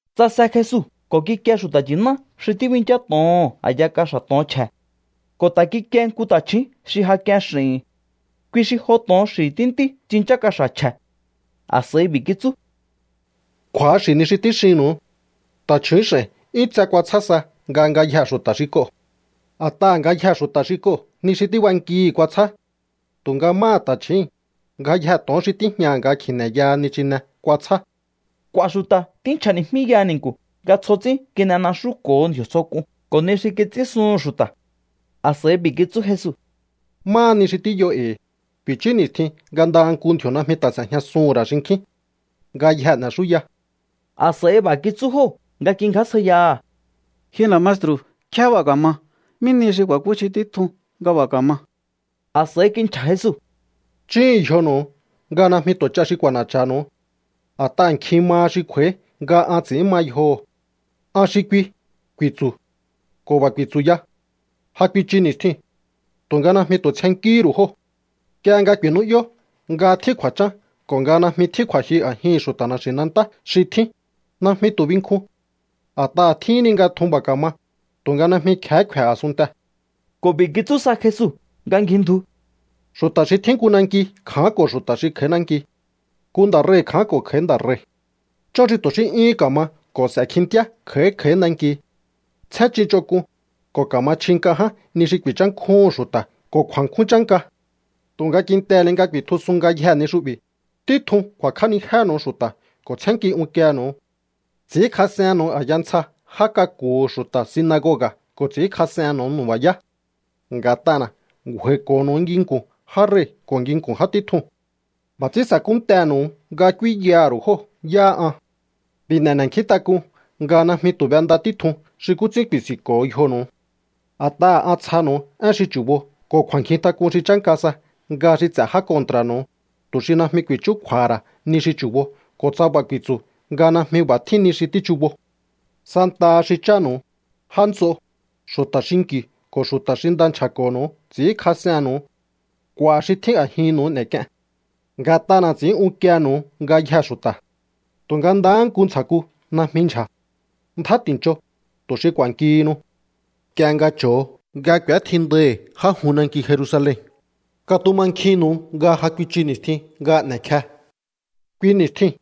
Tsase Jesu ko̱ kikie xu̱ta̱ nchi̱ná xi tíbinchá to̱oho̱n a̱ya kaxa̱ to̱on chje̱. Ko̱ ta̱ kikie nku ta̱chju̱ún xi ja k'ien x'i̱hi̱n. Kui xi jo to̱on xi̱ tíntí tsinchá kaxa̱ chje̱. A̱s'a̱i b'i̱ kitsú: —Kju̱axi̱ ni xi tíxinnu̱u. Ta̱chju̱ún x'a̱i̱n 'yún tse kuatsjá sa nga ngayjee̱ xu̱ta̱ xi k'oo̱. A̱t'aha̱ ngayjee̱ xu̱ta̱ xi k'oo̱ ni xi tíb'ankihi̱ kuatsjá. Tu̱nga máha ta̱chjíi̱n, ngayjee̱ to̱on xi tíjñaha̱ nga kji̱ne̱yaha nichine kuatsjá. K'u̱a̱ xu̱ta̱ tínchja̱ni̱jmíyaha ni̱nku̱ nga tsjo ts'ín kin'enaxúko̱ho ndji̱o̱ tsjo k'un ko̱ ni xi kits'ínsuhun xu̱ta̱. A̱s'a̱i b'i̱ kitsú Jesu: —Máha ni xi tíyo e̱i̱, ku̱i̱chú ni̱stjin nga ndaha nku ndji̱o̱ najmi ta̱ s'e̱jñasuhu̱n ra̱ xinkjín. Ngayjee̱ n'e̱xúya. A̱s'a̱i b'a̱ kitsú jóo̱ nga kingjásjaiyaha̱: —Ji nda̱ maestru̱, ¿nkjé b'a̱ ka̱ma? ¿Mí nihi xi ku̱a̱kúchji títjun nga b'a̱ ka̱ma? A̱s'a̱i kinchja̱ Jesu: —Chúhu̱un yjonu̱u nga najmi tu̱ ch'a xi k'u̱a̱na̱cha̱nu̱u. A̱t'aha̱ nkjin maha xi kj'u̱a̱í nga an ts'i̱ín ma yjoho̱. “An xi kui”, ku̱i̱tsu̱. Ko̱ b'a̱ ku̱i̱tsu̱ ya: “Ja kuichu ni̱stjiu̱n.” Tu̱nga najmi tu̱ tsjennkíhí ru̱u jóo̱. Nk'ie nga ku̱i̱nú'yó nga tjín kju̱a̱chán ko̱ nga najmi tjín kju̱a̱jyu a̱jihi̱n xu̱ta̱ na̱xi̱nantá xi tjín, najmi tu̱ binkjun. A̱t'aha̱ tjíhin ni nga tjun b'a̱ ka̱ma, tu̱nga najmi kje̱hé kfe̱ a̱sunntee̱. Ko̱ b'i̱ kitsú sa Jesu nga ngjindju: —Xu̱ta̱ xi tjín nku nanki kja̱ánko̱ xu̱ta̱ xi kj'a̱í nanki. Nku nda̱ rei̱ kja̱ánko̱ kj'a̱í nda̱ rei̱. Chón xi tu̱ xí 'yúhún ka̱ma ko̱ s'e̱ kjintíá kj'a̱í kj'a̱í nanki. Tsjén ch'in ch'onk'un, ko̱ ka̱ma chji nk'a ján ni xi ku̱i̱nchánkjúhu̱n xu̱ta̱ ko̱ kju̱a̱nkjún chánka. ’Tu̱nga kintehe̱ ni nga ku̱i̱tjusun ngayjee̱ ni xu'bi̱, títjun ku̱a̱kj'ánijénu̱u xu̱ta̱ ko̱ tsjénnki unkienu̱u. Ts'i̱ínkjas'ennu̱u a̱ya ntsja já k'aku̱hu̱ xu̱ta̱ sinagoga̱ ko̱ ts'i̱ínkjas'ennu̱u nu̱ba̱yá. Nga̱t'ana̱ ngju̱a̱i̱ko̱ho̱nu̱u nginku̱n já rei̱ ko̱ nginku̱n já títjun. B'a̱ ts'ín sa̱kúntehe̱nu̱u nga k'úínyaha̱ ru̱u jóo̱ yáha an. B'i̱ n'e̱ n'e̱nkjíntak'un nga najmi tu̱ b'enda títjun xi nkú ts'ín ku̱i̱si̱nko̱o yjonu̱u. A̱t'aha̱ an tsjanu̱u én xi chu̱bo ko̱ kju̱a̱nkjintak'un xi chánka sa nga xi ts'e̱ já kontra̱nu̱u, tu̱ xi najmi ku̱i̱chúkju̱a̱ha̱ ra̱ ni xi chu̱bo ko̱ tsa b'a̱ ku̱i̱tsu̱ nga najmi b'a̱ tjín ni xi tíchubo. ’Santaha xi chánu̱u, já nts'o, xu̱ta̱ xinki̱u ko̱ xu̱ta̱ xi nda nchja̱ko̱nu̱u ts'i̱ínkjas'ennu̱u. K'u̱a̱ xi tjín a̱jinnu̱u n'e̱k'ien. Nga̱t'ana̱ ts'i̱ín unkiehe̱nu̱u ngayjee̱ xu̱ta̱. Tu̱nga ndahá nku ntsja̱ku najmi ndyja̱. Ndjá ti̱ncho, tu̱ xi k'u̱a̱nkihinu. ’Nk'ie nga cho̱o nga k'u̱étjindaihi̱ já jun nanki Jerusalen, katumankjinnu̱u nga ja kuichu ni̱stjin nga n'e̱kje. Kui ni̱stjiu̱n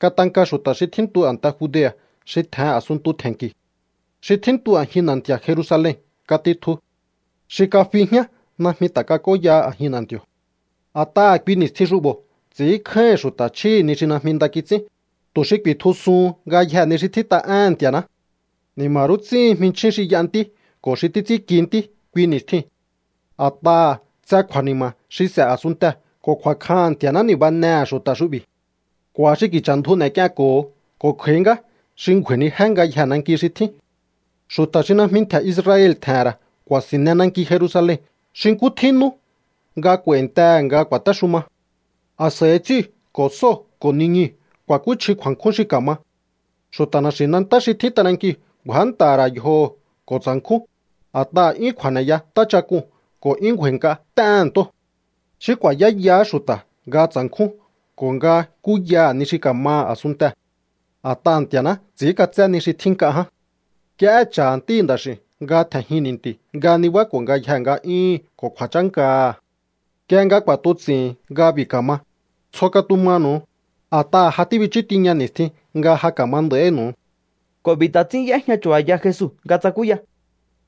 katanka xu̱ta̱ xi tjíntu a̱nte Judea̱ xi tje̱hen a̱sunntu tje̱nnki̱. Xi tjíntu a̱jin na̱nti̱a̱ Jerusalen katitju. Xi kafi jñá najmi ta̱ kak'óyaha a̱jin na̱nti̱o̱. A̱t'aha̱ kui ni̱stjin xu'bo̱ ts'i̱ínkjáíhi̱n xu̱ta̱ chjíhi̱ ni xi najmi nda kits'ín, tu̱ xi ku̱i̱tjusuhun ngayjee̱ ni xi tjít'a éhe̱n Nti̱a̱ná. ¡Ni̱ma̱ rú ts'íhin jminchjín xi y'a ntí ko̱ xi títs'ínki ntí kui ni̱stjiu̱n! A̱t'aha̱ tse kju̱a̱ni̱ma̱ xi s'e̱ a̱sunntee̱ ko̱ kju̱a̱kjaha̱n Nti̱a̱ná ni̱banehe̱ xu̱ta̱ xu'bi̱. K'u̱a̱ xi ki̱cha̱ ndju n'e̱k'ienko̱ho ko̱ kj'a̱í ngá xi ngju̱a̱i̱nijé ngayjee̱ nanki xi tjín. Xu̱ta̱ xi najmi ntje̱ Israel tje̱he̱n ra̱ ku̱a̱si̱nne nanki Jerusalen xi nkú tjín nú nga k'u̱a̱i̱ntehe̱ nga ku̱a̱téxuma. ’A̱s'a̱i ts'íu̱ ko̱ sóo̱ ko̱ niñuu̱ ku̱a̱kúchji kju̱a̱nkjún xi ka̱ma. Xu̱ta̱ na̱xi̱nantá xi tjín t'anankiu̱ ngju̱ánta̱ha̱ ra̱ yjoho̱ ko̱ tsa̱nkjún, a̱t'aha̱ 'yún kju̱a̱ne̱ya ntáchak'uu̱n ko̱ 'yún ngju̱a̱i̱nk'a t'éhe̱n ntóo̱. Xí ku̱a̱yáyahá xu̱ta̱ nga tsa̱nkjún ko̱ nga kúyaha̱ ni xi ka̱maha̱ a̱sunntee̱. A̱t'aha̱ Nti̱a̱ná ts'i̱ínk'atsé ni xi tjín nk'a ján. Nk'iehé cha̱ Ntíhi̱ Nda̱x'i̱u̱n nga tje̱njin ni̱nti̱u̱ nga nibáko̱ ngayjee̱ nga'yúhu̱n ko̱ kju̱a̱chánkaha̱. Nk'ie nga k'u̱a̱tuts'i̱hi̱n nga b'i̱ ka̱ma, tsjo katumanu̱, a̱t'aha̱ ja tíbichú tiña ni̱stjin nga ja ka̱ma nda̱ínu̱u. Ko̱ b'i̱ ta̱ ts'ín y'éjña chu̱ba̱ya Jesu nga tsakúya: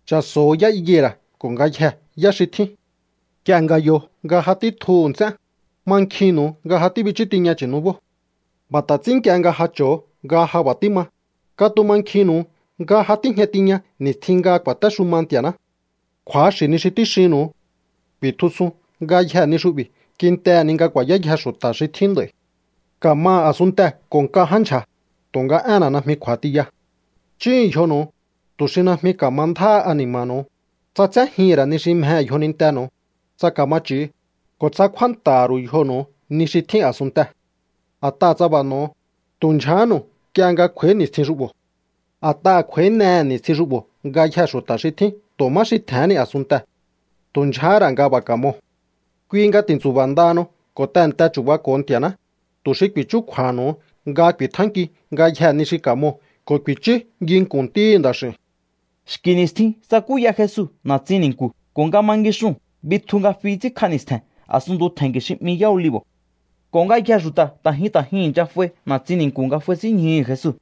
—Cha̱so̱ho̱ yá higuera̱ ko̱ ngayjee̱ yá xi tjín. Nk'ie nga yo nga ja títjuhu̱ nts'én, mankjinnu̱u nga ja tíbichú tiña chu̱nubóo̱. B'a̱ ta̱ ts'ín nk'ie nga ja cho̱o nga ja b'a̱ tíma, katumankjinnu̱u nga ja tíjña tiña ni̱stjin nga ku̱a̱téxuma Nti̱a̱ná. Kju̱axi̱ ni xi tíxinnu̱u. Ku̱i̱tjusun ngayjee̱ ni xu'bi̱ kintehe̱ ni nga ku̱a̱yáyje xu̱ta̱ xi tjín nd'a̱i̱. Ka̱maha̱ a̱sunntee̱ ko̱ nk'a ján ndyja̱, tu̱nga énna̱ najmi kj'u̱a̱ tiya. ’Chúhu̱un yjonu̱u, tu̱ xi najmi ka̱ma ndjáha ani̱ma̱nu̱u, tsa tséjihi̱n ra̱ ni xi mjehe̱ yjonintenu̱u, tsa ka̱ma ch'i̱u, ko̱ tsa kjúánta̱ha̱ ru̱u yjonu̱u ni xi tjín a̱sunntee̱. A̱t'aha̱ tsa b'a̱ n'o̱o, tu̱ ndyjahánu̱u nk'ie nga kj'u̱a̱í ni̱stjin xu'bo̱. A̱t'aha̱ kj'u̱a̱ínehe̱ ni̱stjin xu'bo̱ ngayjee̱ xu̱ta̱ xi tjín tu̱ má xi tje̱hén ni a̱sunntee̱. Tu̱ ndyjehé ra̱ nga b'a̱ ka̱moo̱. Kui nga ti̱ntsu̱ba̱ ndahanu ko̱ tehe̱nte chu̱bako̱o Nti̱a̱ná, tu̱ xi ku̱i̱chúkju̱a̱ha̱nu̱u nga ku̱i̱tjánkiu ngayjee̱ ni xi ka̱moo̱ ko̱ ku̱i̱chú nginku̱n Ntíhi̱ Nda̱x'i̱u̱n. Xki̱ ni̱stjin tsakúya Jesu na̱tsin ni̱nku̱ ko̱ nga ma ngixuu̱n bitju nga fi ts'ínkj'a ni̱stje̱n a̱sunntu tje̱nki̱ xi 'mi Yá Olivo̱. Ko̱ ngayjee̱ xu̱ta̱ ta̱ jyun ta̱ jyun i̱ncha f'ai na̱tsin ni̱nku̱ nga f'aisínñjuhu̱ Jesu.